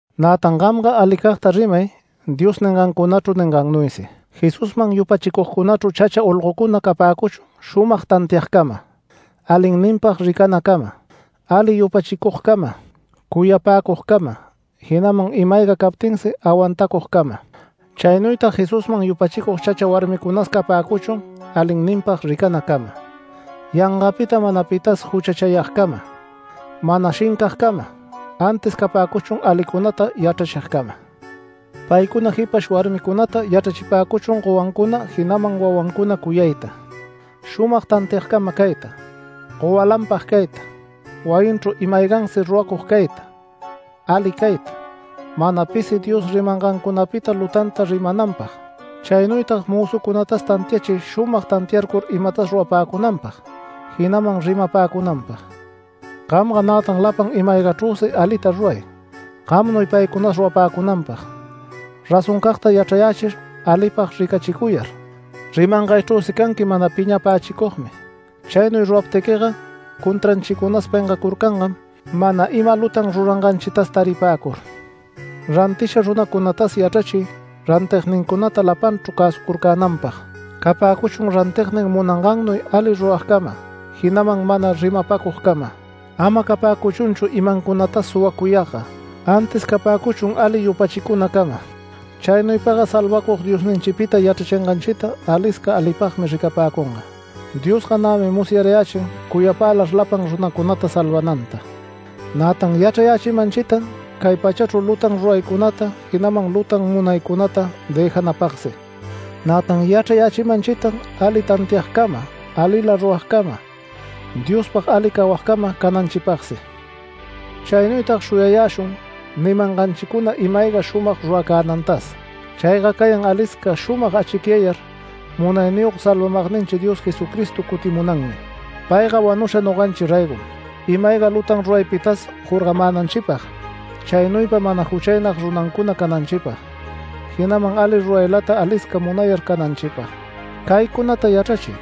Nätan gamga alicagta rimay Dios ningancunachru ningannuysi. Jesusman yupachicugcunachru chacha olgocuna capäcuchun shumag tantiagcama, alinninpag ricanacama, ali yupachicugcama, cuyapäcugcama, jinaman ima-ayga captinsi awantacugcama. Chaynuytag Jesusman yupachicug chacha warmicunas capäcuchun alinninpag ricanacama, yangapita mana pitas juchachayagcama, mana shincagcama, antis capäcuchun alicunata yachrachigcama. Paycuna jipash warmicunata yachrachipäcuchun gowancuna jinaman wawancuna cuyayta, shumag tantiagcama cayta, gowalanpag cayta, wayinchru ima-aygansi ruracug cayta, ali cayta, mana pisi Dios rimangancunapita lutanta rimananpag. Chaynuytag mözucunatas tantiachiy shumag tantiacur imatas rurapäcunanpag jinaman rimapäcunanpag. Gamga nätan lapan ima-aygachrüsi alita ruray, gamnuy paycunas rurapäcunanpag, razoncagta yachrayächir, alipag ricachicuyar. Rimangaychrüsi canqui mana piñapächicugmi. Chaynuy ruraptiquiga contranchicunas pengacurcangam mana ima lutan ruranganchitas taripäcur. Rantisha runacunatas yachrachiy rantignincunata lapanchru cäsucurcänanpag. Capäcuchun rantignin munangannuy ali ruragcama, jinaman mana rimapäcugcama. Ama capäcuchunchu imancunatas suwacuyagga, antis capäcuchun ali yupachicunacama. Chaynuypagga Salvacug Diosninchipita yachrachinganchita alisca alipagmi ricapäcunga. Diosga nämi musyarayächin cuyapälar lapan runacunata salvananta. Nätan yachrayächimanchitan cay pachachru lutan ruraycunata, jinaman lutan munaycunata dëjanapagsi. Nätan yachrayächimanchitan ali tantiagcama, alila ruragcama, Diospag ali cawagcama cananchipagsi. Chaynuytag shuyayäshun nimanganchicuna ima-ayga shumag ruracänantas. Chayga cayan alisca shumag achicyayar munayniyog salvamagninchi Dios Jesucristo cutimunanmi. Payga wanusha noganchi raygom, ima-ayga lutan ruraypitas jorgamänanchipag, chaynuypa mana juchaynag runancuna cananchipag, jinaman ali ruraylata alisca munayar cananchipag. Caycunata yachrachiy,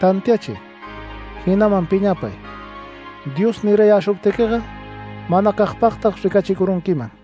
tantiachiy, jinaman piñapay, Dios nirayäshuptiquiga manacagpagtag ricachicurunquiman.